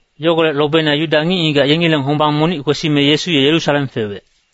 Yogolec lobeina Yuda ngic-ngigac yengileng hombang monic kwesime Yesu ye Yerusalem fewec.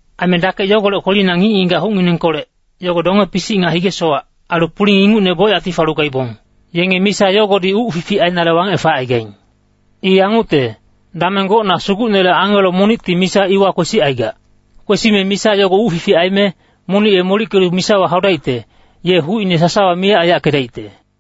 Aime dakec yogolec kwelina ngic-ngigac hucnginengkolec, yogo donge-pisic nga hige-sowac, ailu puling ingucne bocyacti falu gaibong. [Yenge misa yogodi uc fific ainale wangec facaigaing. I yangucte, dameng gocna Sugucnele angelo monicti misa iwa kwesicaigac. Kwesime misa yogo uc fific aime, monic ye molickelu misawa haudaicte, ye hucine sasawa miyac aiyackedaicte.]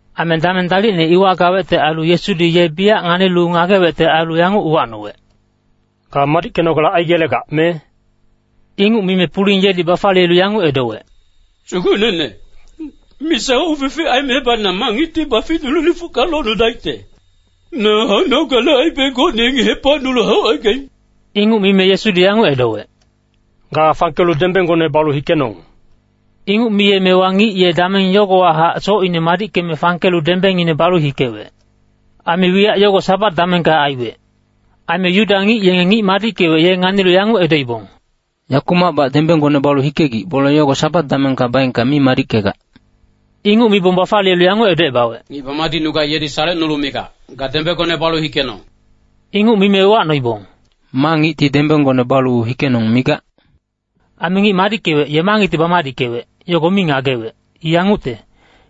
Aime dameng dalicne iwa gawecte ailu Yesudi ye biyac nganilu ngagewecte ailu yanguc uwacnowec, “Ga madickenogale aigelegac, me?” Inguc mime puling yedi bafaliyelu yanguc edowec, “Sugucnene, misa uc fific aimebac na ma ngicti baficnulu lifucka locnudaicte? Na haunogale aibe gocne yengi hepacnulu haucaigaing.” Inguc mime Yesudi yanguc edowec, “Ga fangkelu dembenggone balu hikenong!” Inguc miyemewa ngic ye dameng yogowahac socine madickeme fangkelu dembengine balu hikewec. Aime wiyac yogo Sabat damengka aiwec. Aime Yuda ngic yenge ngic madickewec ye nganilu yanguc edoibong, “Yakumacbac dembenggone balu hikegic, bole yogo Sabat damengka baengka mi madickegac.” Inguc mibong bafaliyelu yanguc edocebawec, “Ngic bamadicnugac yedi salecnulu migac, ‘Ga dembenggone balu hikenong.’” Inguc mime uwacnoibong, “Ma ngicti ‘dembenggone balu hikenong’ migac?” Aime ngic madickewec ye ma ngicti bamadickewec, yogo mi ngagewec. I yangucte,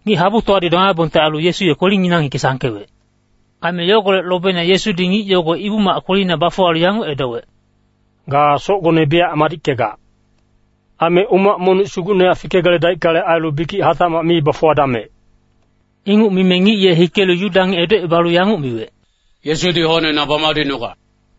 ngic-habutowadi domaibongte ailu Yesu ye kwelinginang hike sangkewec. Aime yogolec lobeina Yesudi ngic yogo Ibu-mac kwelina bafuwalu yanguc edowec, “Ga socgone biyac madickegac. Aime umac monic sugucnehac fikegeledaickale ailu, bikic hatacmac mi bafuwadamec.” Inguc mime ngic ye hikelu Yuda ngic edocebalu yanguc miwec, “Yesudi hocne na bamadicnugac.”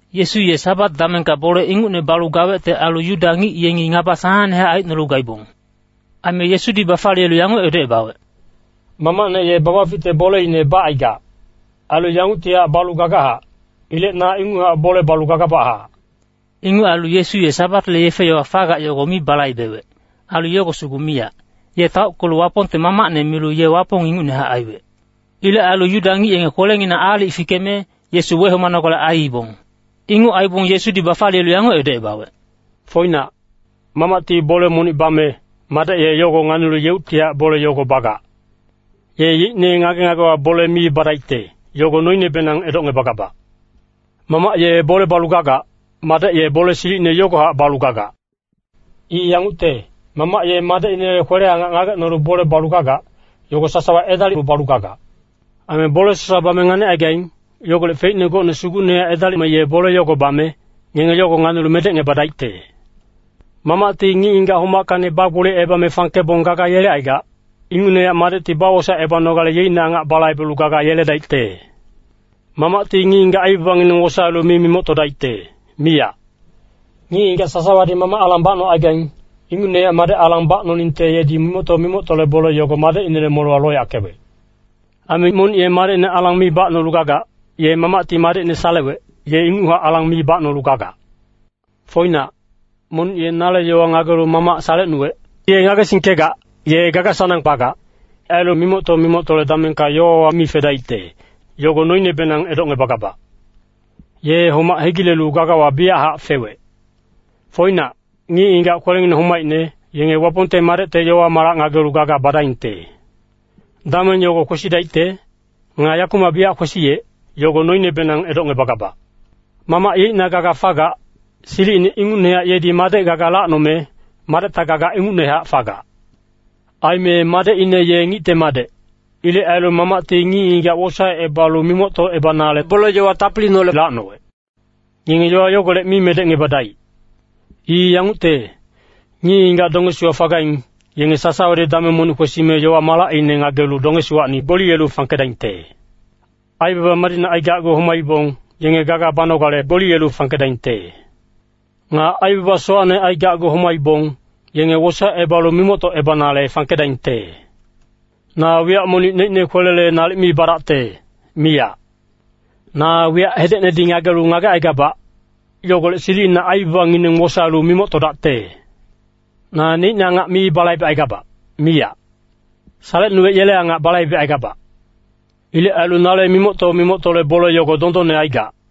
Yesu ye Sabat damengka bole ingucne balu gawecte ailu Yuda ngic yengi ngaba sanangnehac aicnolu gaibong. Aime Yesudi bafaliyelu yanguc edocebawec, “Mamacne ye babaficte boleine bacaigac, ailu yanguctihac balu gagachac. Ilec na inguchac bole balu gagabachac.” Inguc ailu Yesu ye Sabatle yefe-yowa fagac yogo mi balaibewec. Ailu yogo sugu miyac, ye taockelu Wapongte Mamacne milu ye Wapong ingucnehac aiwec. Ilec ailu Yuda ngic yenge kwelenginang aalic fikeme, Yesu wehomanogale aiibong. Inguc aibong Yesudi bafaliyelu yanguc edocebawec, “Foinac, Mamacti bole monic bame, Madec ye yogo nganilu yeuctihac bole yogo bagac. Ye yeicne ngage-ngagewa bole mi badaicte, yogo noinebenang edocngebagabac. Mamac ye bole balu gagac, Madec ye bole silicine yogohac balu gagac. I yangucte, Mamac ye Madecinele kwele-angac ngagecnolu bole balu gagac, yogo sasawa edalilu balu gagac. Aime bole sasawa bame nganicaigaing, yogolec feicne gocne sugucnehac edalime ye bole yogo bame, ngenge yogo nganilu medecngebadaicte. Mamacti ngic-ngigac homackacni bagboliyecebame fangkebong gaga yelecaigac, ingucnehac Madecti bawosaecebanogale yeicne angacine balaibelu gaga yeledaicte. Mamacti ngic-ngigac aibabangineng wosaelu mi mimoctodaicte, miyac. Ngic-ngigac sasawadi Mamac alang bacnocaigaing, ingucnehac Madec alang bacnoningte yedi mimocto-mimoctole bole yogo Madecinele molewa loyackewec. Aime monic ye Madecine alang mi bacnolu gagac, ye Mamacti Madecine salewec, ye inguchac alang mi bacnolu gagac. “Foinac, monic ye nale yowa ngagelu Mamac salecnuwec, ye ngagesingkegac, ye gaga-sanang bagac. Ailu mimocto-mimoctole damengka yowawa mi fedaicte, yogo noinebenang edocngebagabac. Ye homac hegilelu gagawa biyachac fewec. Foinac, ngic-ngigac kwelengineng homaicne, yenge Wapongte Madecte yowa-malac ngagelu gaga badaingte. Dameng yogo kwesidaicte. Nga yakumac biyac kwesiyec, yogo noinebenang edocngebagabac. Mamac yeicna gaga fagac, silicine ingucnehac yedi Madec gaga lacnome, Madecta gaga ingucnehac fagac. Aime Madecine ye Ngicte Madec. Ilec ailu Mamacti ngic-ngigac wosaecebalu mimoctocebanale bole-yowa tapiliineholec lacnowec. “Ngenge yowa yogolec mi medecngebadaic. I yangucte, ngic-ngigac dongesiwa fagaing, yenge sasawadi dameng monic kwesime yowa-malacine ngagelu dongesiwacni gboliyelu fangkedaingte. Aibaba madicne aigacgu homaibong, yenge gaga banogale gboliyelu fangkedaingte. Nga aibaba sowacne aigacgu homaibong, yenge wosaecebalu mimoctocebanale fangkedaingte. Na wiyac monic neicne kwelele nalic mi badacte, miyac. Na wiyac hedecnedi ngagelu ngagecaigabac, yogolec silicina aibabangineng wosaelu mimoctodacte. Naneicne angac mi balaibecaigabac, miyac. Salecnuwec yele angac balaibecaigabac. Ilec ailu nale mimocto-mimoctole bole yogo dondonne aigac.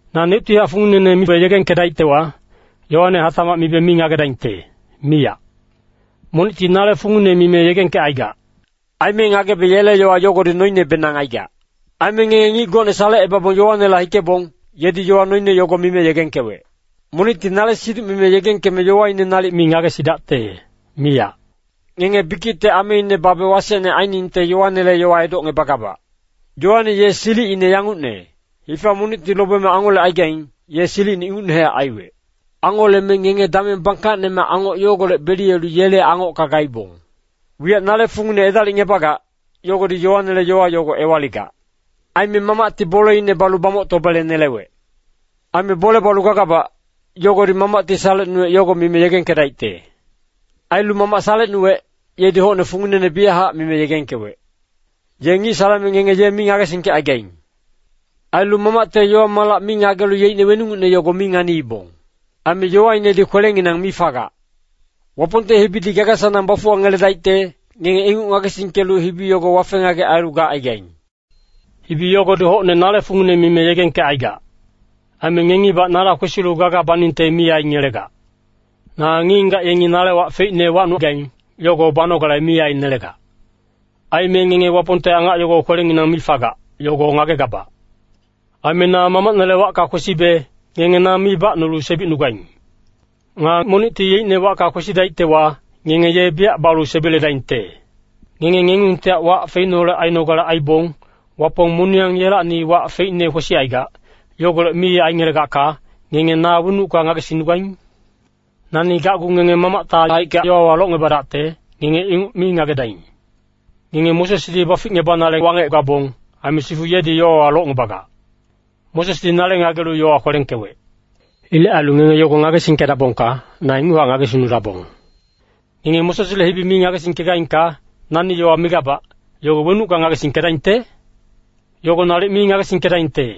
“Naneuctihac funginene mibe yegengkedaictewa, yowane hatac mibe mi ngagedaingte, miyac. Monicti nale fungine mime yegengkecaigac. Aime ngagebe yele yowa yogodi noinebenang aigac. “Aime ngenge ngic gocne salecebabong Yoanela hikebong, yedi yowa noine yogo mime yegengkewec. Monicti nale siduc mime yegengkeme yowaine nalic mi ngagesidacte, miyac. Ngenge bikicte ameine babe wasecne ainingte Yoanele yowa edocngebagabac. Yoane ye silicine yangucne, hifa monicti lobeme angolecaigaing, ye silicine ingucnehac aiwec. Angoleme ngenge dameng bangkacnemac angoc yogolec beliyelu yele angocka gaibong. “Wiyac nale fungine edalicngebagac, yogodi Yoanele yowa yogo ewaligac. Aime Mamacti boleine balu bamoctobele nelewec. Aime bole balu gagabac, yogodi Mamacti salecnuwec yogo mime yegengkedaicte. Ailu Mamac salecnuwec, yedi hocne funginene biyachac mime yegengkewec. Ye ngic saleme ngenge ye mi ngagesingkecaigaing. Ailu Mamacte yowa-malac mi ngagelu yeicne weningucne yogo mi nganiibong. Aime yowainedi kwelenginang mi fagac. Wapongte hibidi gaga-sanang bafuwangeledaicte, ngenge inguc ngagesingkelu hibi yogo wafe-ngagec ailu gacaigaing. Hibi yogodi hocne nale fungine mime yegengkecaigac. Aime ngengibac nala kwesilu gaga baningte mi aingelegac. “Na ngic-ngigac yenge nale wac feicne wacnugaing, yogo banogale mi ainelegac. Aime ngenge Wapongte angac yogo kwelenginang mi fagac, yogo ngagegabac. Aime na Mamacnele wacka kwesibe, ngenge na mi bacnulu sebicnugaing. Nga monicti yeicne wacka kwesidaictewa, ngenge ye biyac balu sebiledaingte. “Ngenge ngengungtihac wac feicneholec ainogale aibong, Wapong moniyang yelacni wac feicne kwesicaigac, yogolec mi aingelegacka, ngenge na wenucka ngagesingnugaing? Nani gacgu ngenge Mamacte haicka yowawa locngebadacte, ngenge inguc mi ngagedaing. Ngenge Mosesdi baficngebanale wangec gabong, aime sifu yedi yowawa locngebagac. Mosesdi nale ngagelu yowa kwelengkewec. Ilec ailu ngenge yogo ngagesingkedabongka, na inguchac ngagesingnudabong. Ngenge Mosesle hibi mi ngagesingkegaingka, nani yowa migabac, yogo wenucka ngagesingkedaingte? Yogo nalic mi ngagesingkedaingte.”